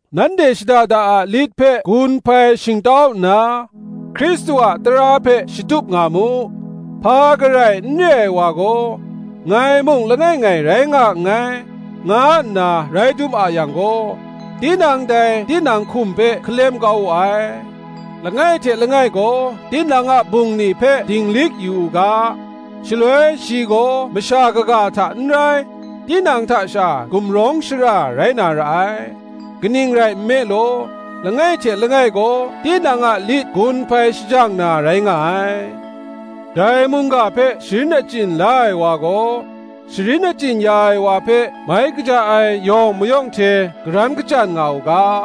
Nanhte shada da a lit hpe gun hpai shingtau nna, Hkristu a tara hpe shatup nga mu. Hpa garai n re ai wa gaw, ngai mung langai ngai rai nga nngai, nga nna rai dum a yang gaw, tinang dai tinang hkum hpe hkalem kau wu ai. Langai hte langai gaw tinang a bungli hpe dinglik yu u ga; shaloi shi gaw masha kaga hta n rai, tinang hta sha gumrawng shara rai na ra ai; kaning rai nme law, langai hte langai gaw tinang a lit gun hpai shajang na rai nga ai. Dai mungga hpe sharin achyin la ai wa gaw, sharin achyin ya ai wa hpe mai kaja ai yawng mayawng hte karan kachyan nga u ga.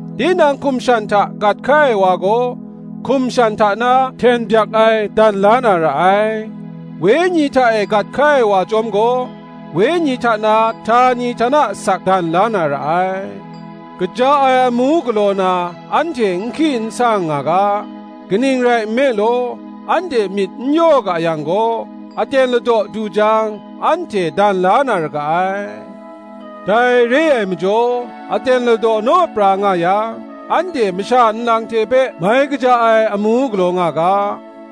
Tinang hkum shan hta gat hkai ai wa gaw, hkum shan hta na hten byak ai dan la na ra ai; Wenyi hta e gat hkai ai wa chyawm gaw, Wenyi hta na htani htana asak dan la na ra ai. Kaja ai amu galaw na, anhte n hki n sang nga ga: kaning rai nme law, anhte myit n yaw ga yang gaw, aten ladaw du jang, anhte dan la na ra ga ai. Dai re ai majaw, aten ladaw naw pra nga yang, anhte masha nlang hte hpe mai kaja ai amu galaw nga ga,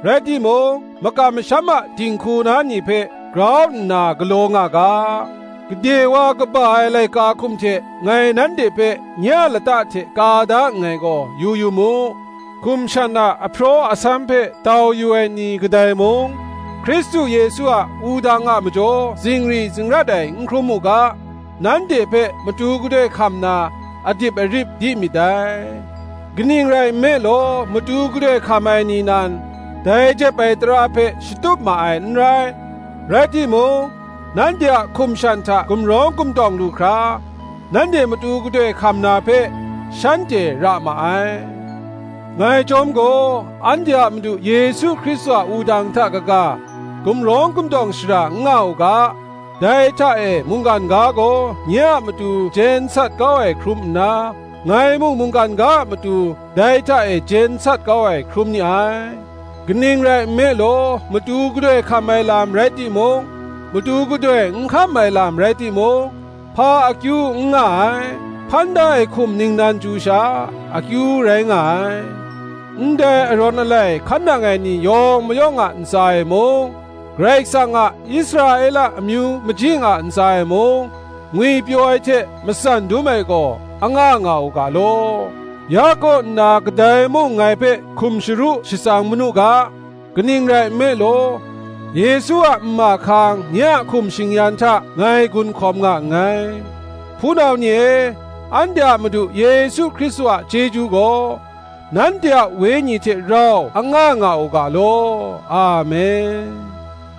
rai timung, makam masham a dinghku na ni hpe, grau nna galaw nga ga. Gade wa kaba ai laika hkum hte ngai nanhte hpe nye a lata hte ka da nngai gaw, yu yu mu. Hkum shan a ahpraw nsam hpe tau yu ai ni kadai mung, Hkristu Yesu a wudang a majaw zingri zingrat ai n hkrum mu ga, nanhte hpe matu gadoi hkam na, adip arip di myit dai. Kaning rai nme law, matu gadoi hkam ai ni nan, dai jep ai tara hpe shatup ma ai n rai; rai timung, nanhte a hkum shan hta gumrawng gumtawng lu hkra, nanhte matu gadoi hkam na hpe, shanhte ra ma ai. Ngai chyawm gaw, anhte a Madu Yesu Hkristu a wudang hta kaga, gumrawng gumtawng shara n nga u ga: dai hta e mungkan ga gaw nye a matu jen sat kau ai hkrum nna, ngai mung mungkan ga a matu dai hta e jen sat kau ai hkrum ni ai. Kaning rai nme law, matu gadoi hkam ai lam rai timung, matu gadoi n hkam ai lam rai timung, hpa akyu n nga ai: hpan da ai hkum ningnan chyu sha, akyu rai nga ai. Ndai arawn alai hkan nang ai ni yawng mayawng a ntsa e mung, Karai Kasang a Israela amyu majing a ntsa e mung, ngwipyaw ai hte matsan dum ai gaw, anga nga u ga law. Ya kaw nna kadai mung ngai hpe hkum sharu shatsang manu ga: kaning rai nme law, Yesu a nma hkang nye a hkum shing-yan hta ngai gun hkawm nga nngai. Hpunau ni e, anhte a Madu Yesu Hkristu a chyeju gaw, nanhte a Wenyi hte rau anga nga u ga law. Amen.